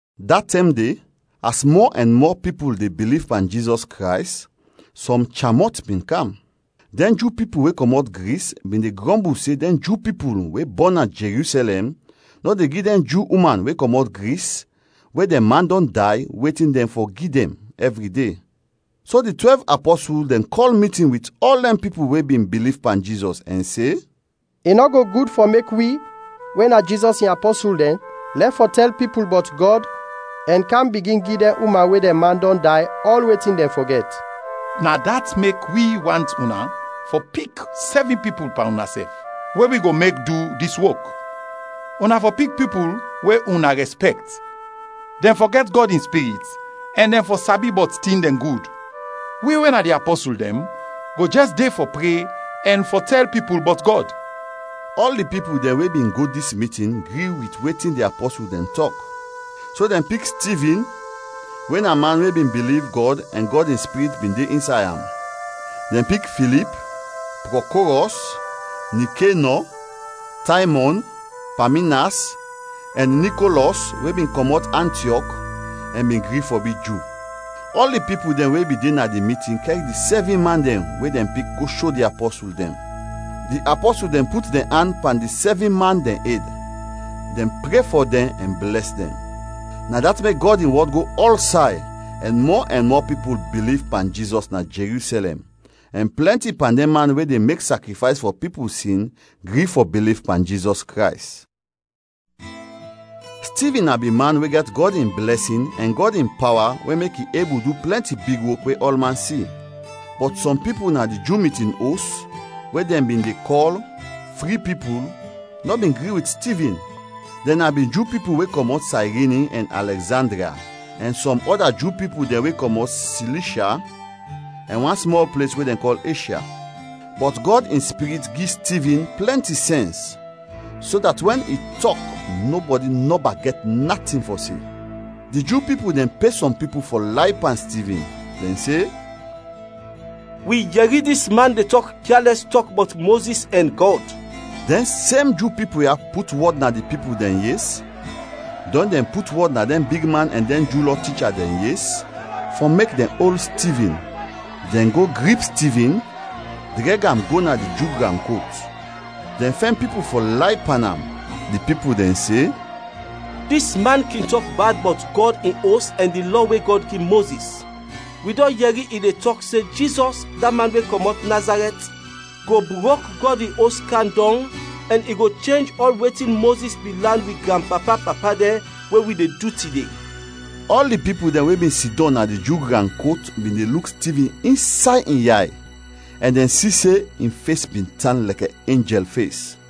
Da tɛm de, as mɔ ɛn mɔ pipul de biliv pan Jizɔs Krays, sɔm cham-mɔt bin kam. Dɛn Ju pipul we kɔmɔt Gris bin de grɔmbul se dɛn Ju pipul we bɔn na Jerusɛlɛm nɔ de gi dɛn Ju uman we kɔmɔt Gris we dɛn man dɔn day, wetin dɛn fɔ gi dɛn ɛvri de. So, di twɛlv apɔsul dɛn kɔl mitin wit ɔl dɛn pipul we bin biliv pan Jizɔs ɛn se, “I nɔ go gud fɔ mek wi, we na Jizɔs in apɔsul dɛn, lɛf fɔ tɛl pipul bɔt Gɔd ɛn kam bigin gi dɛn uman we dɛn man dɔn day ɔl wetin dɛn fɔ gɛt. Na dat mek wi want una fɔ pik sɛvin pipul pan unasɛf, we wi go mek du dis wok. Una fɔ pik pipul we una ɔl rɛspɛkt, dɛn fɔ gɛt Gɔd in Spirit ɛn dɛn fɔ sabi bɔt tin dɛn gud. Wi, we na di apɔsul dɛn, go jɛs de fɔ pre ɛn fɔ tɛl pipul bɔt Gɔd.” Ɔl di pipul dɛn we bin go dis mitin gri wit wetin di apɔsul dɛn tɔk. So dɛn pik Stivin, we na man we bin biliv Gɔd ɛn Gɔd in Spirit bin de insay am. Dɛn pik Filip, Prɔkorɔs, Nikenɔ, Taymɔn, Paminas, ɛn Nikolɔs we bin kɔmɔt Antiɔk ɛn bin gri fɔ bi Ju. Ɔl di pipul dɛn we bin de na di mitin kɛr di sɛvin man dɛn we dɛn pik go sho di apɔsul dɛn. Di apɔsul dɛn put dɛn an pan di sɛvin man dɛn ed, dɛn pre fɔ dɛn ɛn blɛs dɛn. Na dat mek Gɔd in wɔd go ɔlsay ɛn mɔ ɛn mɔ pipul biliv pan Jizɔs na Jerusɛlɛm, ɛn plɛnti pan dɛn man we de mek sakrifays fɔ pipul sin gri fɔ biliv pan Jizɔs Krays. Stivin na bin man we gɛt Gɔd in blɛsin ɛn Gɔd in pawa we mek i ebul du plɛnti big wok we ɔlman si. Bɔt sɔm pipul na di Ju mitin os we dɛn bin de kɔl “fri pipul” nɔ bin gri wit Stivin. Dɛn na bin Ju pipul we kɔmɔt Sayrini ɛn Alɛgzandria, ɛn sɔm ɔda Ju pipul dɛn we kɔmɔt Silishya ɛn wan smɔl ples we dɛn kɔl Eshya. Bɔt Gɔd in Spirit gi Stivin plɛnti sɛns, so dat wɛn i tɔk nɔbɔdi nɔba gɛt natin fɔ se. Di Ju pipul dɛn pe sɔm pipul fɔ lay pan Stivin. Dɛn se, “Wi yɛri dis man de tɔk kyalɛs tɔk bɔt Mozis ɛn Gɔd.” Dɛn sem Ju pipul ya put wɔd na di pipul dɛn yes, dɔn dɛn put wɔd na dɛn bigman ɛn dɛn Ju Lɔ ticha dɛn yes, fɔ mek dɛn ol Stivin. Dɛn go grip Stivin, drɛg am go na di Ju gran kot. Dɛn fɛn pipul fɔ lay pan am; di pipul dɛn se, “Dis man kin tɔk bad bɔt Gɔd in Os ɛn di Lɔ we Gɔd gi Mozis. Wi dɔn yɛri i de tɔk se Jizɔs, da man we kɔmɔt Nazarɛt, go brok Gɔd in Os kam dɔng ɛn i go chenj ɔl wetin Mozis bin lan wi granpapa-papa dɛn we wi de du tide.” Ɔl di pipul dɛn we bin sidɔm na di Ju gran kot bin de luk Stivin insay in yay, ɛn dɛn si se in fes bin tan lɛkɛ enjɛl fes.